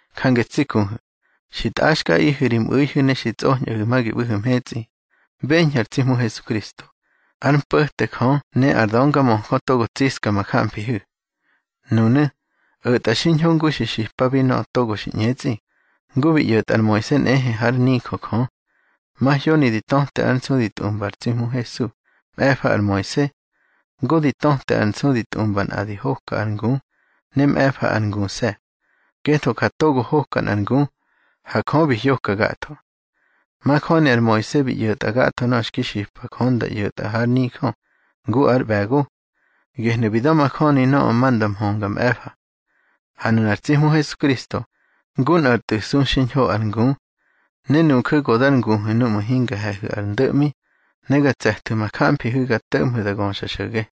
Jange tsi kuhu̱, xi tꞌaxkꞌaꞌihu̱ ri mꞌu̱ihu̱ ne xi tsꞌoñꞌahu̱ ma gi ꞌbu̱hu̱ mhetsꞌi, beñhu̱ ar tsi Hmu Hesukristo, ár mpo̱te Jö ne ar döngamöjö togo tsiska ma jamfihu̱. Nunu̱, o̱tꞌa xiñho ngu xi xipabi nöꞌö togo xi ꞌñetsꞌi, ngu bi ꞌyo̱tꞌa ar Moise nꞌehe hár nijö Jö. Mahyoni di töte ar nsu di tꞌumba ar tsi Hmu Hesu, mꞌe̱fa ar Moise. Ngu di töte ar nsu di tꞌumba nꞌa di hoka ar ngu, ne mꞌe̱fa ar nguse̱. Ngetho ja togo hoka nꞌar ngu, ha Jö bi hyoka gatho. Majöni ar Moise bi ꞌyo̱tꞌa gatho nöꞌö xki xipa Jö nda ꞌyo̱tꞌa hár nijö, ngu ár ꞌbe̱go. Gehnu̱ bi da̱majöni nöꞌö ma nda mhönga mꞌe̱fa. Ha nunar tsi Hmu Hesukristo, ngu nꞌar tꞌu̱ su xiñho ar ngu. Ne nuju̱ go dar nguhu̱ nuꞌmu̱ hinga he̱hu̱ ar ndo̱ꞌmi, ne ga tse̱thu̱ ma jamfihu̱ ga to̱ꞌmhu̱ da göxa xo̱ge.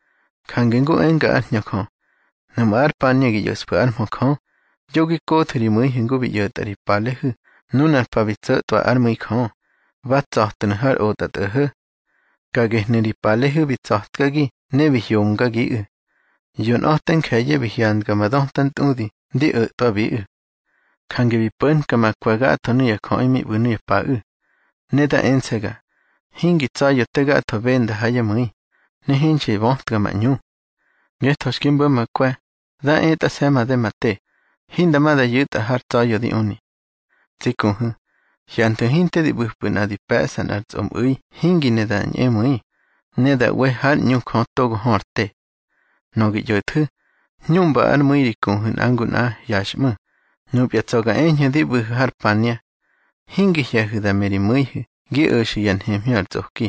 Jange ngu enga ár Hñö Jö: Nuꞌmu̱ ar pania gi ꞌyo̱ꞌsfu̱ ár mhö Jö, yo gi kothu̱ ri mu̱ihu̱ ngu bi ꞌyo̱tꞌa ri palehu̱ nunar pa bi tso̱tꞌwa ár mu̱i Jö, ba tsa̱tnu̱ har otꞌatꞌo̱ho̱. Ka gehnu̱ ri palehu̱ bi tsa̱tkagi ne bi hyomgagiꞌu̱. Yonꞌa̱te nje̱ye̱ bi hyandga ma döta ntꞌudi ndi o̱tꞌwabiꞌu̱. Jange bi po̱nka ma kwe̱ gatho nuya jöꞌi mi ꞌbu̱ nuya paꞌu̱. Ne da ense̱ga: Hingi tsa̱ya̱ te gatho benda ha yá mu̱i, ne hinxi bötka ma ꞌñu. Ngetho xki mbo̱ ma kwe̱, da etꞌase̱ made ma te, hinda ma da yu̱tꞌa har tsa̱ya̱ di uni. Tsi kuhu̱, hyanthu̱ hinte di ꞌbu̱pꞌu̱ nꞌa di pe̱ꞌsa nꞌar tsꞌomu̱i hingi ne da ñꞌemu̱i, ne da ꞌwe hár ꞌñu Jö togo hö ar te. Nöꞌö gi ꞌyo̱thu̱, hñuꞌmba ár mu̱i ri kuhu̱ nꞌa ngu nꞌa hyaxꞌmu̱, núpya tsa̱ ga eñhu̱ di ꞌbu̱hu̱ ar pania. Hingi hye̱hu̱ da me ri mu̱ihu̱ gi o̱xu̱ yá nhemhñö ar tsꞌoki.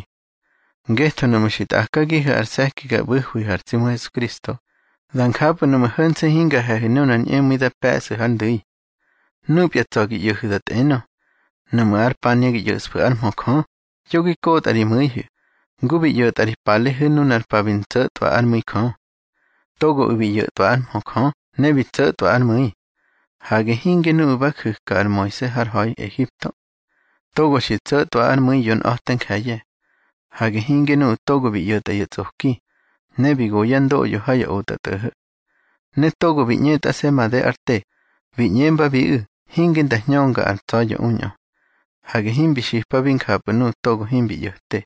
Ngetho nuꞌmu̱ xi tꞌakagihu̱ ar se̱ki ga ꞌbu̱hwihu̱ ar tsi Hmu Hesukristo, da njapꞌu̱ nuꞌmu̱ ho̱nse̱ hinga he̱hu̱ nunar ñꞌemu̱i da pe̱ꞌsu̱ hár ndu̱i. Núpya tsa̱ gi ꞌyo̱hu̱ da tꞌenö: Nuꞌmu̱ ar pania gi ꞌyo̱ꞌsfu̱ ár mhö Jö, yo gi kotꞌa ri mu̱ihu̱, ngu bi ꞌyo̱tꞌa ri palehu̱ nunar pa bi ntso̱tꞌwa ár mu̱i Jö. Togoꞌu̱ bi ꞌyo̱twa ár mhö Jö ne bi tso̱tꞌwa ár mu̱i. Hage hinge nuꞌu̱ ba ju̱ka ar Moise har ha̱i Ehipto. Togo xi tso̱tꞌwa ár mu̱i yonꞌa̱te nje̱ye̱. Hage hinge nuꞌu̱ togo bi ꞌyo̱tꞌa ya tsꞌoki, ne bi go yá ndoꞌyo ha ya otꞌatꞌo̱ho̱. Ne togo bi ꞌñetꞌase̱ made ár te, bi ꞌñembabiꞌu̱ hinge nda hñönga ar tsa̱ya̱ uñꞌö. Hage himbi xipabi njapꞌu̱ nuꞌu̱ togo himbi ꞌyo̱te.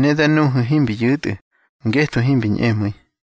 Ne da nuhu̱ himbi yu̱tꞌu̱, ngetho himbi ñꞌemu̱i.